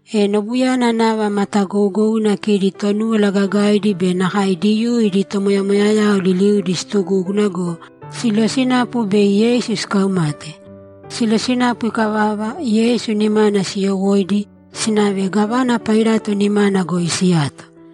E nobuyana nava matagougouna kidi Tonúwala Gagaidi be nakae Diyuu idi tomoyamoyayao liliudi situgúguna go, silosinapu bei Yeisu sikaumate. Silosinapu ikavava, Yeisu nimana siyowóidi, sinave gávana Pailato nimana goi siyato.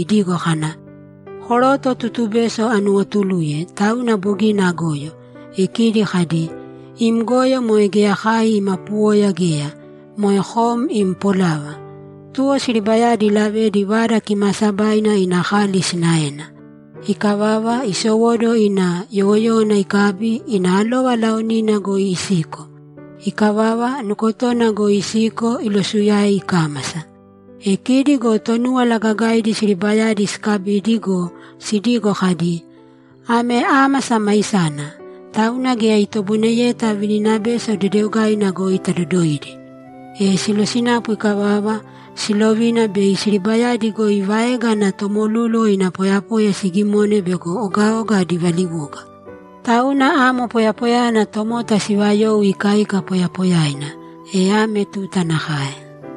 idigo kana, ‘Koroto tutubeso anuwotuluye, tauna bogina agoyo.’ E kidi kadi, ‘Im goyo moe geya kai ima puwoya geya. Moe kom im polava.’ Tuwo siribayadi ilavedi Vada Kimaasabaina ina kali sinaena. Ikavava, isowóduwo ina yowoyówana ikabi, ina alova laonina goi isiko. Ikavava, nukotona goi isiko ilosuyae ikámasa. E kidi go Tonúwala Gagaidi siribayadi sikabidi go, sidigo kadi, ‘Ame ámasa maisana, tauna geya itoboineyeta vininabeso dedeogaina goi tadodoidi.’ E silosinapu ikavava, silovina bei siribayadi goi vaega ana tomolúluwo ina poyapoya sigimone bego ogaoga adi valiwoga. Tauna amo poyapoyayana tomota sivayou ikaika poyapoyaina, e ame tuta nakae.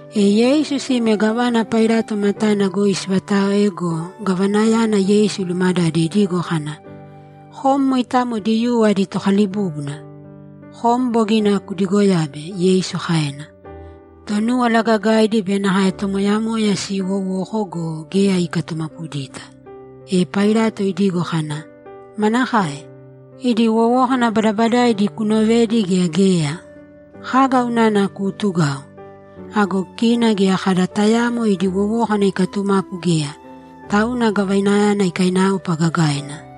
E Yeisu sime gávana Pailato matana goi sivataoe go, gavanayana Yeisu ilumadade idigo kana, ‘Kom moitamo Diyuu adi tokalibúbuna?’ ‘Kom bogina kudigoyabe’, Yeisu kaena. Tonúwala Gagaidi be nakae tomoyamoya siiwowoko go, geya ikatumapudita. E Pailato idigo kana, ‘Manakae? Idi wowókana badabadaidi kunovedi gea geya? Kaga unana kuutugau?’ Ago kina geya kada tayaamo idi wowókana ikatumapu geya, tauna gavanayana ikainaopa gagaina.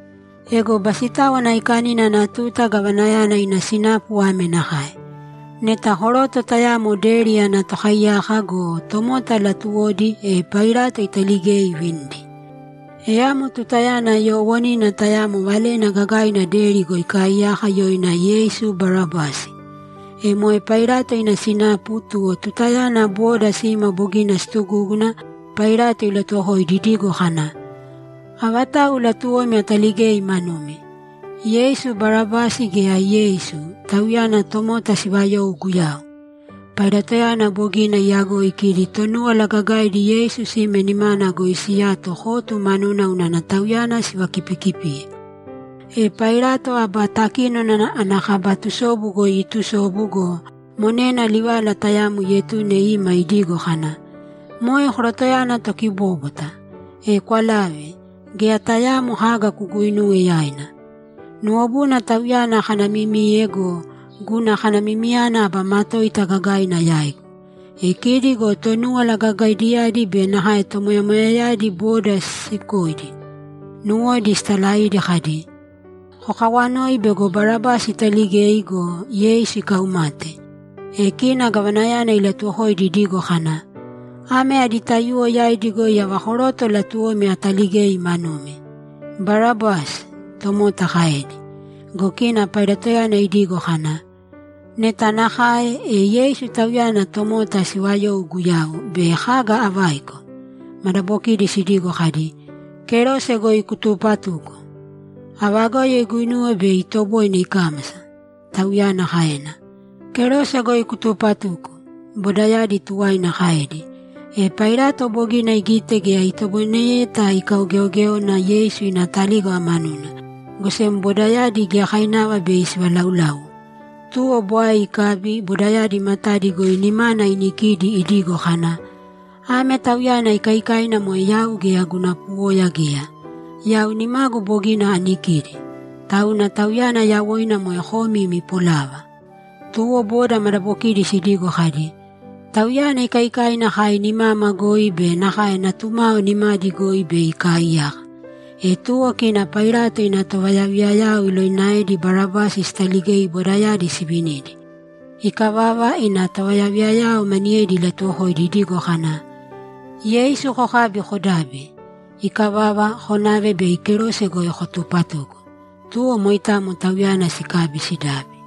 Ego Basitáwana Aikanina ana tuta gavanayana ina sinapu ame nakae: Neta koroto tayamo deri ana tokaiyaka go, tomota latuwodi, e Pailato italigei ivinidi. E amo tutayana yoowonina tayamo valena gagaina deri goi ikaaiyaka yoina Yeisu Barabasi. E moe Pailato ina sinapu, tuwo tutayana boda sima bogina situgúguna, Pailato ilatuwokoidi idigo kana, ‘Avatau latuwomi ataligei manumi? Yeisu Barabasi gea Yeisu, Tauyana tomota siivayou Guyau?’ Pailatoyana bogina iyagoi kidi Tonúwala Gagaidi Yeisu sime nimana goi siyato kotu manuna unana Tauyana sivakipikipiye. E Pailato aba takínona ana kaba tusobu goi iitusobu go, monena livala tayamo ietune ima idigo kana, ‘Moe korotoyana tokibóbwata, e kwalāve. Geya tayaamo kaga kuguinūwe yaina. Nuwobuna Tauyana akanamimiye go, guna kanamimiyana aba matoita gagaina yaigu.’ E kidi go Tonúwala Gagaidiyadi be nakae tomoyamoyayadi boda sisiukoidi, nuwodi sitalaidi kadi, ‘Kokawanōi bego Barabasi italigei go, Yeisu ikaumate.’ E kina gavanayana ilatuwokoidi idigo kana, ‘Ame adi taiyuwo yaidi goi ava koroto latuwomi ataligei manumi?’ ‘Barabasi!’ tomota kaedi. Go kina Pailatoyana idigo kana, ‘Neta nakae, e Yeisu, Tauyana tomota siivayou Guyau, bei kaga avaiko?’ Madabokidi sidigo kadi, ‘Kerose goi kutupatūko!’ ‘Ava goyo iguinuwe bei itoboine ikámasa?’ tauyana kaena. ‘Kerose goi kutupatūko!’ bodayadi tuwaina kaedi. E Pailato bogina igite geya itoboineyeta ikaugeogéona Yeisu ina talígava manuna, go sem bodayadi giyakainava bei sivalauláuwo. Tuwo bwae ikabi bodayadi matadi goi nimana inikidi idigo kana, ‘Ame Tauyana ikaikaina moe yau geya guna puwoya geya. Yau nimagu bogina anikidi. Tauna Tauyana yawoina moe komi imi polava.’ Tuwo boda madabokidi sidigo kadi, ‘Tauyana ikaikaina kai nimama goi be nakae natumao nimadi goi bei ikaaiyaka.’ E tuwo kina Pailato ina tovayaviyayao ilovinaedi Barabasi sitaligei bodayadi sivinidi. Ikavava, ina tovayaviyayao maniyedi ilatuwokoidi idigo kana, ‘Yeisu kokābi, kodābi. Ikavava, konāve bei kerose goi kotupatūko.’ Tuwo moitamo Tauyana sikabi sidabi.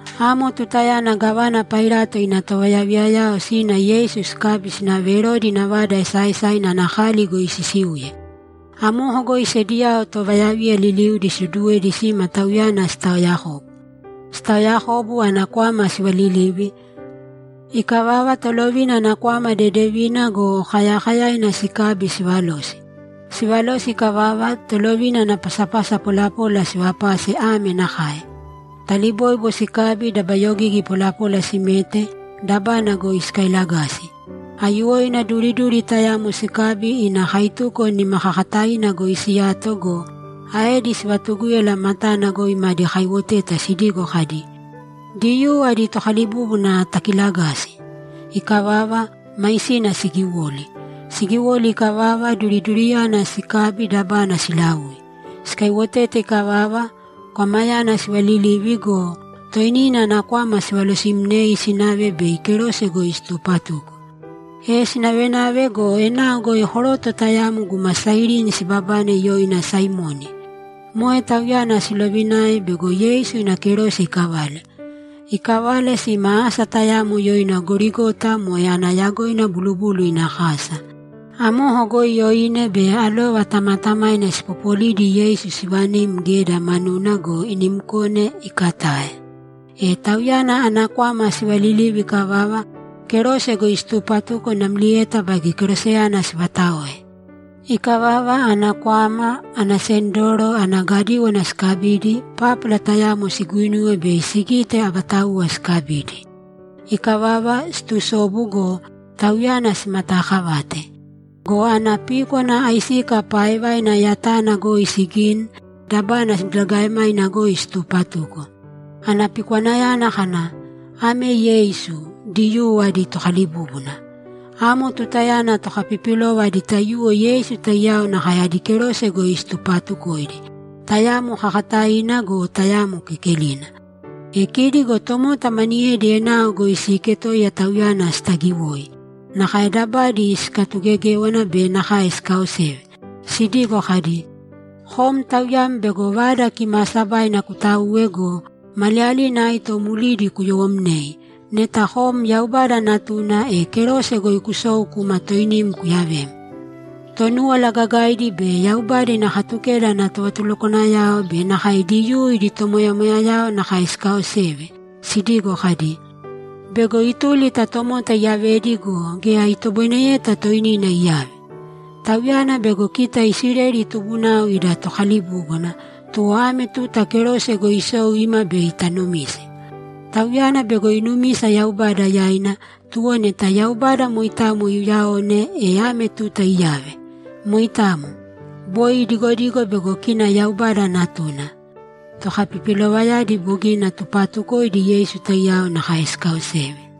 Amo tutayana gávana Pailato ina tovayaviyayao sina Yeisu sikabi sinave Erodi ina vada esaaesaina ana kali goi sisiuye. Amoko goi sediyao tovayaviya liliudi siduduwedi sima Tauyana sitaoyakobu. Sitaoyakobu, ana kwama sivalilivi. Ikavava, tolovina ana kwama dedevina go, kayakayaina sikabi sivalosi. Sivalosi ikavava, tolovina ana pasapasa polapola sivapase ame nakae: Taliboibo sikabi dabayogigi polapola simete, dabana goi sikailagasi. Aiyuwoina duriduri tayamo sikabi ina kaituko nimakakataina goi siyato go, aedi sivatugúyala matana goi madi kaiwoteta sidigo kadi, ‘Diyuu adi tokalibúbuna takiilagāsi!’ Ikavava, maisina sigiwoli. Sigiwoli ikavava, duriduriyana sikabi, dabana silaui. Sikaiwotete ikavava, kwamayana sivalilivi go, toinina ana kwama sivalosimnei, sinave bei kerose goi situpatuko. E sinavenave go, enao goi koroto tayamo guma Sairini sibabane yoina Saimoni. Moe tauyana silovinae bego Yeisu ina kerose ikavale. Ikavale, sima asa tayamo yoina Gorigota (moe ana yagoina Bulubulu ina Kasa). Amoko goi oine be alova tamatamaina sipopolidi Yeisu sivanim geda manuna go, inimkone, ikatae. E Tauyana ana kwama sivalilivi ikavava, kerose goi situpatuko namlieta baige keroseyana sivataoe. Ikavava ana kwama, ana sendoro, ana gadíwana sikabidi, pápala tayamo siguinuwe bei sigite avatauwa sikabidi. Ikavava, situsobu go, Tauyana simataakavate. Go ana píkwana aisika paaevaina tayamo goi sigini, dabana diligaemaina goi situpatuko. Ana pikwanayana kana, ‘Ame Yeisu, Diyuu adi Tokalibúbuna.’ Amo tutayana tokapipilova adi taiyuwo Yeisu taiyao nakae adi kerose goi situpatukoidi, tayamo kakataina go, tayamo kekelina. E kidi go tomota maniyedi enao goi siiketoiya Tauyana sitagiwoi. Nakae dabadi sikatugegéwana be nakae sikaoseve sidigo kadi, ‘Kom Tauyam bego Vada Kimaasabaina kutauwe go, maliyalina aito mlidi kuyowomnei, neta kom Yaubada Natuna, e kerose goi kusōu kūma toinim kuyavēm.’ Tonúwala Gagaidi be Yaubada ina Katukeda ana tovatulukwanayao be nakae Diyuu idi tomoyamoyayao nakae sikaoseve sidigo kadi, ‘Bego ituli ta tomota iyavedi go, geya itoboineyeta toinina iyave. Tauyana bego kita Isileli tubunao ida Tokalibúbuna, tuwo ame tuta kerose goi isōu īma bei tanumise. Tauyana bego inumisa Yaubada yaina, tuwo neta Yaubada moitamo iuyaone, e ame tuta iyave. Moitamo. Boi idigodigo bego kina Yaubada Natuna.’ Tokapipilovayadi bogina tupaatukoidi Yeisu taiyao nakae sikaaoseve.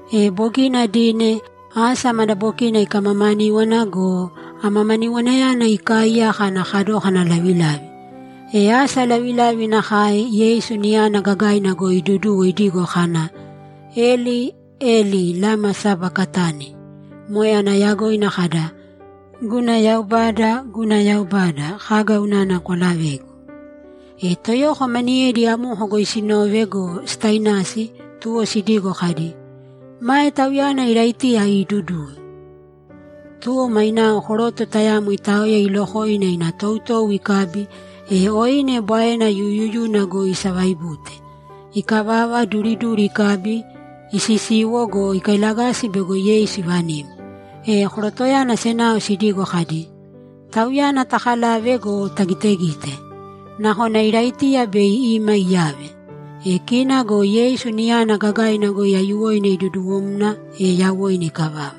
E bogina dine, asa madabokina ikamamaníwana go, amamaniwanayana ikaaiyaka ana kadókana lavilavi. E asa lavilavi nakae, Yeisu niyana gagaina goi iduduwo idigo kana, ‘Eli Eli lama sabakatani?’ Moe ana yagoina kada, ‘Guna Yaubada, guna Yaubada, kaga unana kwalavegu?’ E toyoko maniyedi amoko goi sinove go, sitainasi, tuwo sidigo kadi, ‘Mae Tauyana Iraitiya iiduduwe.’ Tuwo mainao koroto tayamo itaoya ilokoina ina toutou ikabi, e oine bwaena yuyuyuna goi isavaibute. Ikavava, duriduri ikabi, isisiwo go, ikailagasi bego Yeisu ivanim. E korotoyana senao sidigo kadi, ‘Tauyana takalāve go, tagitegīte. Nakona Iraitiya bei ima iyave.’ E kina go Yeisu niyana gagaina goi aiyuwoina iduduwomna, e yawoina ikavava.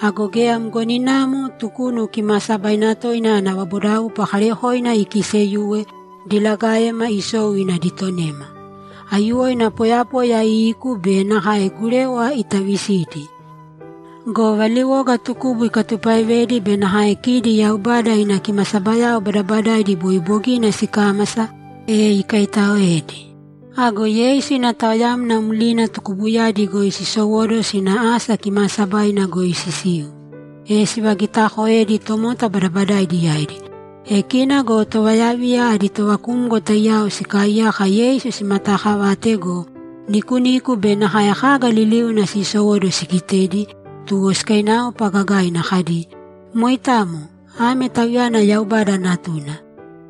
Ago geya mgoninamo Tukunu Kimaasabaina Toina ana vabodaupa kaarekoina ikiiseyuwe, dolagaema isou ina ditonema. Aiyuwoina poyapoya iiku be nakae gurewa itavisidi. Go valiwoga tukubu ikatupaevedi be nakae kidi Yaubada ina kimasabayao badabadaidi boi bogina sikámasa, e ikaitaoedi. Ago Yeisu ina taoyamna mlina tukubuyadi goi sisowóduwo sina asa kimaasabaina goi sisiu, e sivagitakoedi tomota badabadaidi yaidi. E kina go tovayaviya adi tovakumgo taiyao sikaaiyaka Yeisu simataakavate go, nikuniku be nakae kaga liliuna sisowóduwo sigitedi, tuwo sikainaopa gagaina kadi, ‘Moitamo, ame Tauyana Yaubada Natuna.’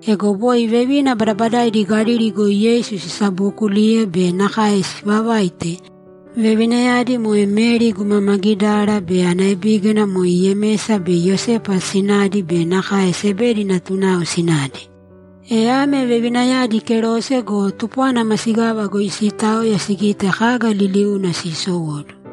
Ego boi vevina badabadaidi Galili goi Yeisu sisabookuliye be nakae sivavaite. Vevinayadi moe Meri guma Magidara be ana ebígana moe Yemesa be Iyosepa sinadi be nakae Sebedi natunao sinadi. E ame vevinayadi kerose go, tupwana masigava goi siitaoya sigite kaga liliuna siisowóduwo.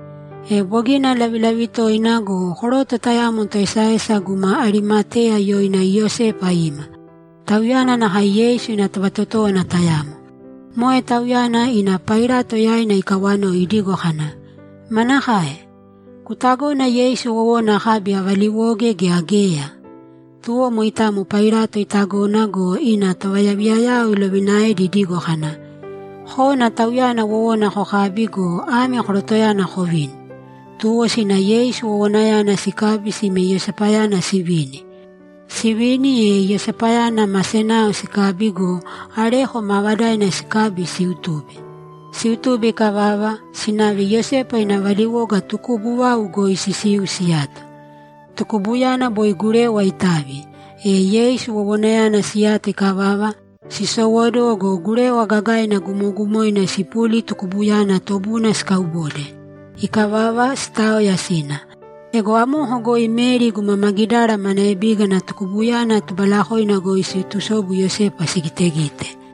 E bogina lavilavi toina go, koroto tayamo toesaesa guma Arimateya yoina Iyosepa ima. Tauyana nakae Yeisu ina tovatotówana tayamo. Moe tauyana ina Pailato yaina ikawanoi idigo kana, ‘Manakae? Kutagona Yeisu wowona akabi avaliwoge gea geya?’ Tuwo moitamo Pailato itagona go, ina tovayaviyayao ilovinaedi idigo kana, ‘Kōna Tauyana wowona kokābi go, ame korotoyana kovīni.’ Tuwo sina Yeisu wowonayana sikabi sime Iyosepayana sivini. Sivini, e Iyosepayana ma senao sikabi go, areko maavadaina sikabi, siutube. Siutube ikavava, sinave Iyosepa ina valiwoga tukubu vau goi sisiu siyato. Tukubuyana boi gurewa itavi. E Yeisu wowonayana siyato ikavava, sisowóduwo go, gurewa gagaina gumogumoina sipuli tukubuyana tobuna sikaubode. Ikavava, sitaoya sina. Ego amoko goi Meri guma Magidara mana ebígana tukubuyana tubalakoina goi siitusobu Iyosepa sigitegite.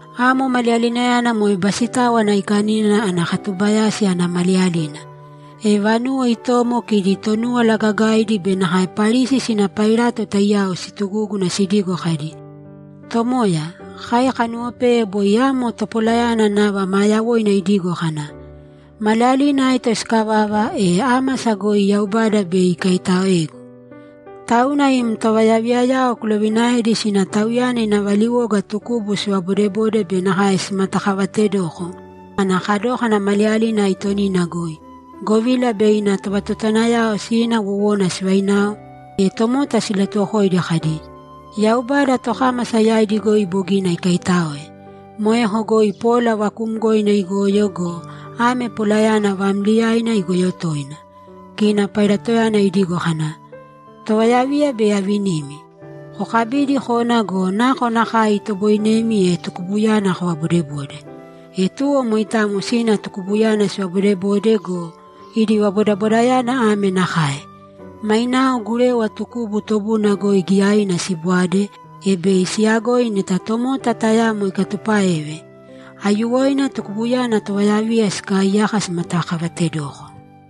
Amo maliyalinayana moe Basitáwana Aikanina ana katubayásina ana maliyalina. E vanuwo itomo kidi Tonúwala Gagaidi be nakae Parisi sina Pailato taiyao situgúguna sidigo kadi, ‘Tomoya, kai kanuwopeye boi amo topolayana nava maa yawoina idigo kana, “Maliyalina aito sikavava, e ámasa goi Yaubada bei ikaitaoegu.” Tauna im tovayaviyayao kulovinaēdi sina Tauyana ina valiwoga tukubu sivabodebode be nakae simatakavatedoko ana kadókana maliyalina aitonina goi, govila bei ina tovatotowanayao sina wowona sivainao, e tomota silatuwokoidi kadi, “Yaubada tokámasa yaidi goi bogina ikaitáoe.” Moeko goi pola vakuumgoina igoyo go, ame polayana vaamliyaina igoyo toina.’ Kina Pailatoyana idigo kana, ‘Tovayaviya bei avinimi. Kokabīdi kōna go, nakonakae itoboinemi, e tukubuyana kovabodebōde.’ E tuwo moitamo sina tukubuyana sivabodebode go, idi vabodabodayana ame nakae: Mainao gurewa tukubu tobuna goi giyaina sibwade, e bei siyagoi neta tomota tayamo ikatupáeve. Aiyuwoina tukubuyana tovayaviya sikaaiyaka simatakavatedoko.